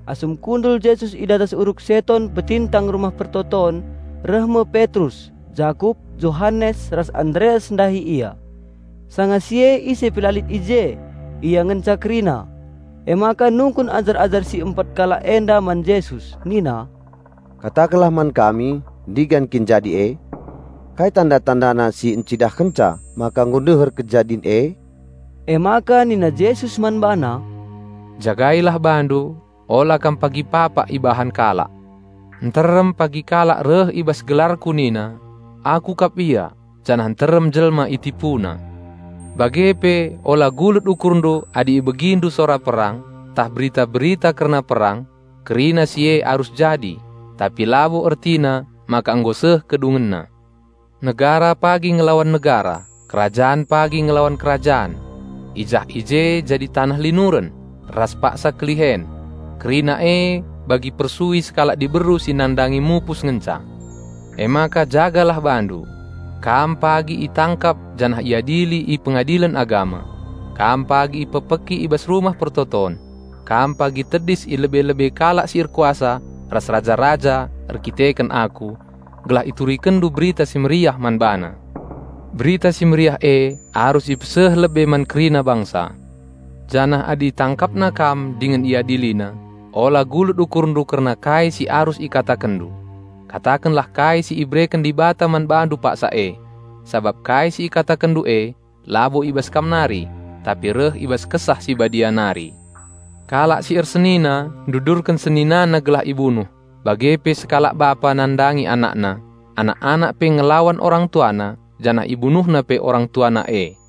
Asum kundul Jesus i datas Uruk Seton petingtang Rumah Pertoton, reh me Petrus, Jakup, Johanes ras Andreas ndahi Ia. Sanga si e ise pe la lit i je, ia ngenca kerina. Emaka nungkun ajar-ajar si empat kalak enda man Jesus nina, "Katakenlah man kami ndigan kin jadi e? Kai tanda-tandana si encidahkenca maka nggo ndeher kejadin e?" Emaka nina Jesus man bana, "Jagailah bandu, ola kam pagi papak ibahan kalak. Nterem pagi kalak reh i bas gelarKu nina, 'Aku kap Ia!' Janah nterem jelma itipuna. Bage pe ola gulut ukurndu adi ibegindu sora perang, ntah berita-berita kerna perang. Kerina si e arus jadi, tapi labo ertina maka nggo seh kedungenna. Negara pagi ngelawan negara, kerajan pagi ngelawan kerajan. I jah i je jadi taneh linuren, ras paksa kelihen. Kerina e bagi persui sekalak diberu si nandangi mupus ngenca. Emaka jagalah bandu! Kam pagi itangkap janah iadili i pengadilen agama. Kam pagi ipekpeki i bas rumah persembahen; kam pagi tedis i lebe-lebe kalak si erkuasa ras raja-raja erkiteken Aku gelah iturikenndu Berita Si Mehuli man bana. Berita Si Mehuli e arus ipeseh lebe man kerina bangsa. Janah adi itangkapnandu dingen iadilina ola gulut ukurndu kerna kai si arus ikatakenndu. Katakenlah kai si ibereken Dibata man bandu paksa e. Sabap kai si ikatakenndu e labo i bas kam nari, tapi reh i bas Kesah Si Badia nari. Kalak si ersenina ndudurken seninana gelah ibunuh, bage pe sekalak bapa nandangi anakna. Anak-anak pe ngelawan orang tuana, janah ibunuhna pe orang tuana e.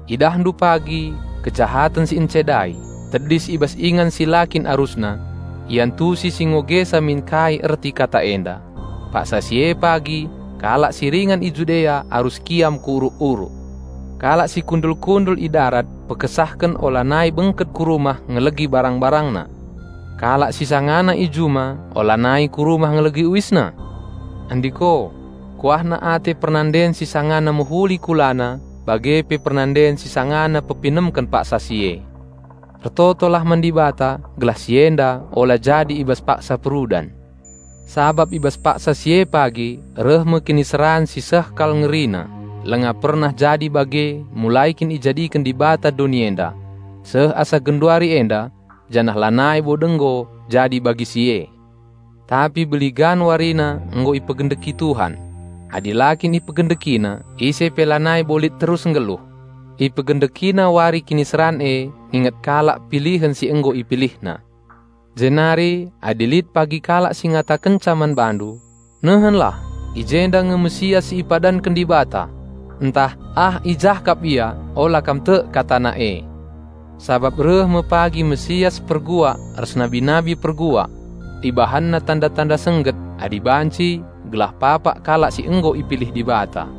"Idahndu pagi 'kejahaten Siencedai' tedis i bas ingan si la kin arusna. (Iantusi si ngogesa min kai erti kata enda.) Paksa si e pagi kalak si ringan i Judea arus kiam ku uruk-uruk. Kalak si kundul-kundul i darat pekesahken olanai bengket ku rumah ngelegi barang-barangna. Kalak si sangana i juma olanai ku rumah ngelegi uisna. Andiko, kuahna ate pernanden si sangana mehuli kulana bage pe pernanden si sangana pepinemken paksa si e. Ertotolah man Dibata gelah si enda ola jadi i bas paksa perudan. Sabap i bas paksa si e pagi reh me kiniseran si seh kal ngerina, langa pernah jadi bage mulai kin ijadiken Dibata doni enda, seh asa genduari enda, janah lanai bo denggo jadi bagi si e. Tapi beligan warina nggo ipegendeki Tuhan. Adi la kin IpegendekiNa, ise pe lanai bo lit terus nggeluh. IpegendekiNa wari kiniseran e nginget kalak pilihen si nggo IpilihNa. Jenari adi lit pagi kalak si ngatakenca man bandu, 'Nehenlah, i jenda nge Raja Penampat si ipadanken Dibata!', ntah 'Ah i jah kap Ia,' ola kam tek katana e. Sabap reh me pagi Raja Penampat palsu ras nabi-nabi palsu. Ibahanna tanda-tanda sengget, adi banci, gelah papak kalak si nggo ipilih Dibata.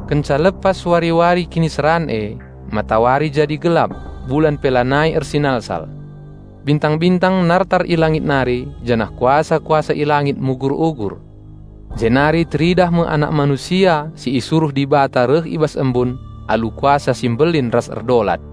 "Kenca lepas wari-wari kiniseran e, matawari jadi gelap, bulan pe lanai ersinalsal. Bintang-bintang nartar i langit nari janah kuasa-kuasa i langit mugur-ugur. Jenari teridah me Anak Manusia si isuruh Dibata reh i bas embun, alu kuasa si mbelin ras erdolat.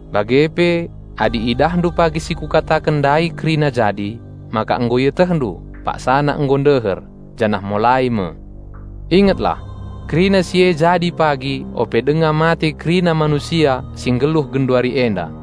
Bage pe adi idahndu pagi si Kukataken ndai kerina jadi, maka nggo ietehndu, paksana nggo ndeher, janah molai me. Ingetlah! Kerina si e jadi pagi ope denga mate kerina manusia si nggeluh genduari enda.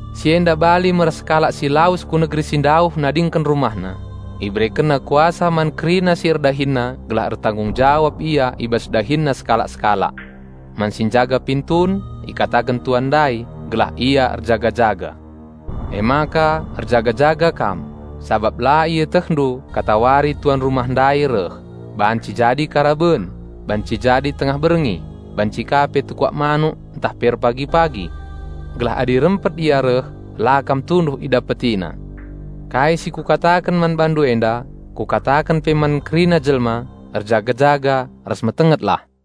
Si enda bali me ras sekalak si lawes ku negeri si ndauh nadingken rumahna. Iberekenna kuasa man kerina si erdahinna gelah ertanggung jawab ia i bas dahinna sekalak-sekalak. Man si njaga pintun ikataken tuan ndai gelah ia erjaga-jaga. Emaka erjaga-jaga kam, sabap la ietehndu katawari tuan rumah ndai reh, banci jadi karaben, banci jadi tengah berngi, banci ka pe tekuak manuk ntah pe erpagi-pagi. Gelah adi rempet ia reh, la kam tunduh idapetina. Kai si Kukataken man bandu enda, Kukataken pe man kerina jelma: Erjaga-jaga ras metengetlah."